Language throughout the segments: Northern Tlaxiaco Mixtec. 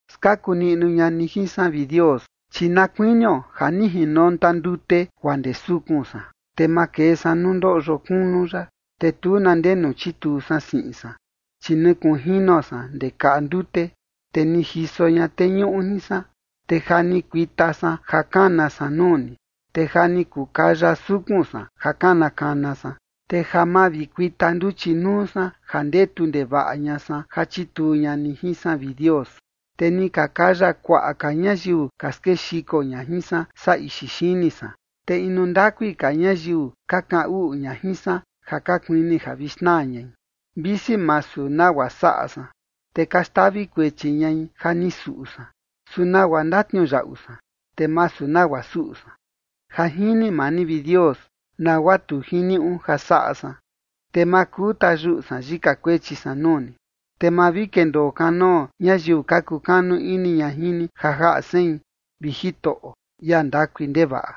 Skaku niꞌnu ña ni jin san, vi Dios, chi na kuinio ja ni jinonta ndute guaa ndee sukun san. Te makee san nuu ndoꞌyo kunu yaꞌa, te tu na ndenu chituu san siꞌin san, chi ni kunjino san ndee kaꞌa ndute, te ni jiso ña teñuꞌu jin san. Te ja ni kuita san ja kana san nuu ni, te ja ni kukaya sukun san ja kana kana san, te ja mavikuita nduchi nuu san ja ndetu ndevaꞌa ña san ja chituu ña ni jin san, vi Dios. Te ni ka kaya kuaꞌa ka ñayiu ka skexiko ña jin san, saa ixi xini san, te inu ndakui ka ñayiu ka kaꞌan uꞌu ña jin san ja ka kuini ja vi xnaa ñai, visi masu nagua saꞌa san, te ka xtavi kuechi ñai ja ni suꞌu san, su ¿nagua ndatniuyaꞌu san, te masu nagua suꞌu san? Ja jini maa ni, vi Dios, nagua tu jiniuꞌu ja saꞌa san, te ma kuu tayuꞌu san yika kuechi san nuu ni. Te ma vi kendoo kanoo ñayiu ka kukanu ini ña jin ni ja jaꞌa sein, vi Jitoꞌo, ia ndakui ndevaꞌa,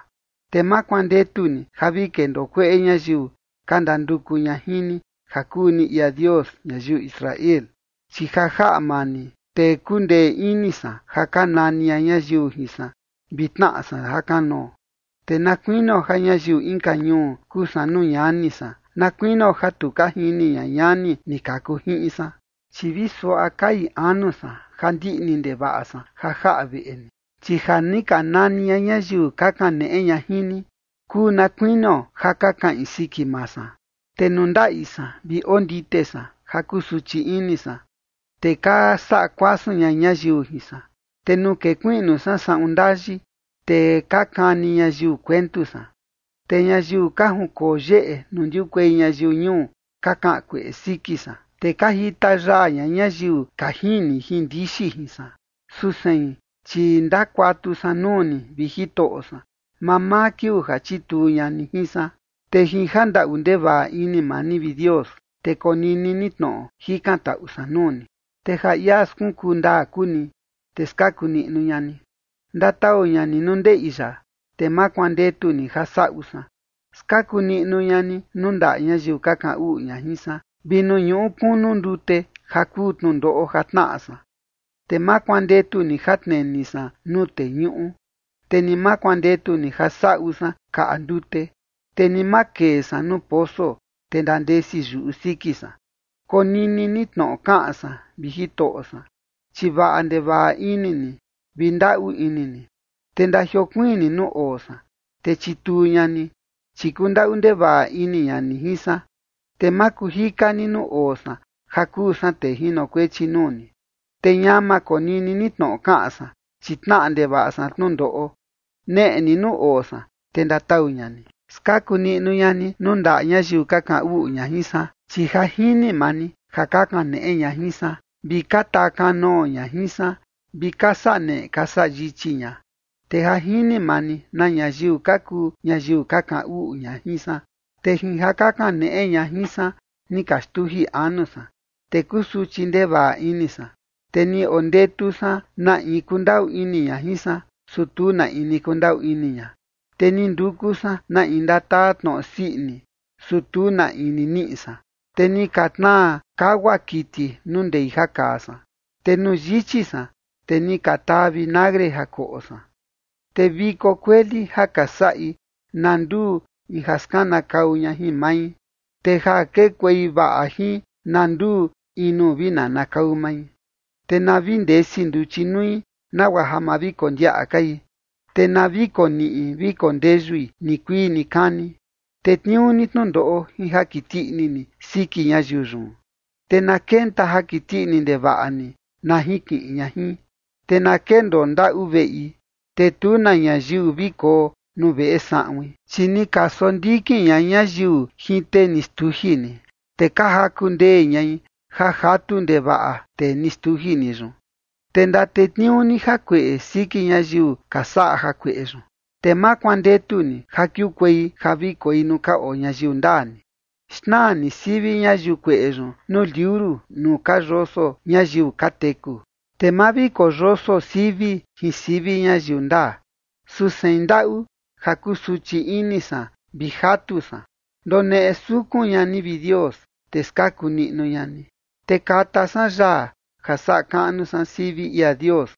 te ma kuandetu ni ja vi kendoo kueꞌe ñayiu ka ndanduku ña jin ni, ja kuu ni ia Dios ñayiu Israel. Chi ja jaꞌa maa ni, te kundee ini san ja ka nani ña ñayiu jin san, vi tnaꞌa san jakanoo. Te na kuinio ja ñayiu inka ñuu kuu san nuu ñani san, na kuinio ja tu ka jini ña ñani ni kaku jiꞌin san. Chi vi suaꞌa kai anu san ja ndiꞌni ndevaꞌa san ja jaꞌa veꞌe ni, chi ja ni ka nani ña ñayiu ka kaneꞌe ña jin ni, kuu na kuinio ja ka kaꞌin siki maa san. Te nuu ndaꞌi san vi ondite san ja kusuchi ini san, te ka saꞌa kuasun ña ñayiu jin san. Te nuu kekuiꞌnu san saꞌun ndayi, te ka kani ñayiu kuentu san. Te ñayiu ka junkoo yeꞌe nuu ndiukuei ñayiu ñuu ka kaꞌan kueꞌe siki san, te ka jita yaa ña ñayiu ka jini jin ndixi jin san. Su sein, chi ndakuatu san nuu ni, vi Jitoꞌo san, mamaa kiuu ja chituu ña ni jin san. Te jin jandaꞌu ndevaꞌa ini maa ni, vi Dios, te konini ni tnoꞌo jikantaꞌu san nuu ni, te ja ia skunkuu ndaa kuu ni, te skaku niꞌnu ña ni. Ndatau ña ni nuu ndeꞌi yaꞌa, te ma kuandetu ni ja saꞌu san. Skaku niꞌnu ña ni nuu ndaꞌa ñayiu ka kaꞌan uꞌu ña jin san, vi nuu ñuꞌu kunu ndute ja kuu tnundoꞌo ja tnaꞌa san. Te ma kuandetu ni ja tneni san nuu teñuꞌu, te ni ma kuandetu ni ja saꞌu san kaꞌa ndute, te ni ma kee san nuu poso, te ndandesi yuꞌu siki san. Konini ni tnoꞌo kaꞌan san, vi Jitoꞌo san, chi vaꞌa ndevaꞌa ini ni vi ndaꞌu ini ni. Te ndajiokuiin ni nuu oo san, te chituu ña ni, chi kundaꞌu ndevaꞌa ini ña ni jin san. Te ma kuu jika ni nuu oo san ja kuu san tee jinokuechi nuu ni, te ñama konini ni tnoꞌo kaꞌan san, chi tnaꞌa ndevaꞌa san tnundoꞌo. Neꞌe ni nuu oo san, te ndatau ña ni. Skaku niꞌnu ña ni nuu ndaꞌa ñayiu ka kaꞌan uꞌu ña jin san. Chi ja jini maa ni ja ka kaneꞌe ña jin san, vi ka taa kanoo ña jin san vi ka saꞌa neꞌe ka saꞌa yichi ña. Te ja jini maa ni na ñayiu ka kuu ñayiu ka kaꞌan uꞌu ña jin san. Te jin ja ka kaneꞌe ña jin san ni ka xtuji anu san, te kusuchi ndevaꞌa ini san, te ni ondetu san na in kundaꞌu ini ña jin san, su tu na in ni kundaꞌu ini ña, te ni nduku san na in ndataa tnoꞌo sii ini, su tu na in ni niꞌi san. Te ni ka tnaa kagua kiti nuu ndei ja kaa san, te nuu yichi san, te ni ka taa vinagre ja koꞌo san. Te viko kueli ja ka saꞌi, na nduu in ja skanakau ña jin mai, te ja kekuei vaꞌa jin, na nduu in nuu vi nanakau mai. Te na vi ndesi nduchi nui nagua ja ma vi kondiaꞌa kai, te na vi koniꞌi vi kondeyui nikuii nikani. Tetniuu ni tnundoꞌo jin ja kiti ini ni siki ñayiu yun, te na kenta ja kiti ini ndevaꞌa ni na jinkiꞌin ña jin. Te na kendoo ndaꞌu veꞌi, te tu ka na ñayiu vi koo nuu veꞌe saꞌuin. Chi ni ka sondikin ña ñayiu jin tee ni xtuji ni, te ka jaku ndee ñai ja jatu ndevaꞌa tee ni xtuji ni yun. Te ndatetniuu ni jakueꞌe siki ñayiu ka saꞌa jakueꞌe yun, te ma kuandetu ni ja kiukuei ja vi koi nuu ka oo ñayiu ndaa ni. Xnaa ni sivi ñayiu kueꞌe yun nuu liuru nuu ka yoso ñayiu ka teku, te ma vi koyoso sivi jin sivi ñayiu ndaa. Su sein ndaꞌu ja kusuchi ini san vi jatu san. Ndoneꞌe sukun ña ni, vi Dios, te skaku niꞌnu ña ni. Te kata san yaa ja saꞌa kaꞌnu san sivi ia Dios,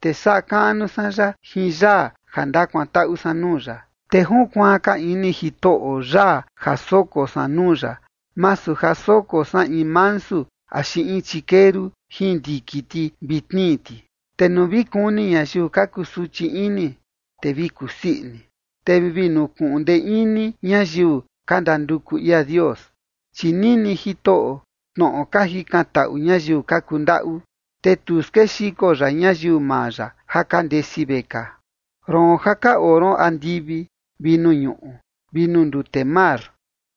te saꞌa kaꞌnu san ya jin yaa ja ndakuantaꞌu san nuu ya. Te junkuaan ka ini Jitoꞌo yaa ja soko san nuu ya, masu ja soko san in mansu axi in chikeru jin ndiki ti vi tnii ti. Te nuu vi kuni ñayiu ka kusuchi ini, te vi kusii ini. Te vi nukuꞌun ndee ini ñayiu ka ndanduku ia Dios. Chi nini Jitoꞌo tnoꞌo ka jikantaꞌu ñayiu ka kundaꞌu, te tu skexiko ya ñayiu maa ya ja ka ndesi vekaa. Roon ja ka oo ron andivi vi nuu ñuꞌu vi nuu ndute mar,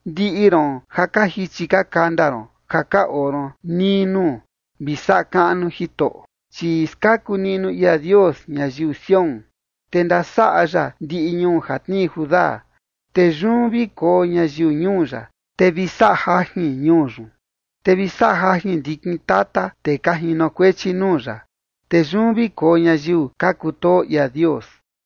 ndiꞌi ron ja ka jichi ka kanda ron ja ka oo ron nii nuu, vi saꞌa kaꞌnu Jitoꞌo. Chi skaku niꞌnu ia Dios ñayiu Sión, te ndasaꞌa ya ndiꞌi ñuu ja tnii Judá, te yun vi koo ñayiu ñuu ya, te vi saꞌa jajin ñuu yun. Te vi saꞌa jajin ndikin tata tee ka jinokuechi nuu ya, te yun vi koo ñayiu ka kutoo ia Dios.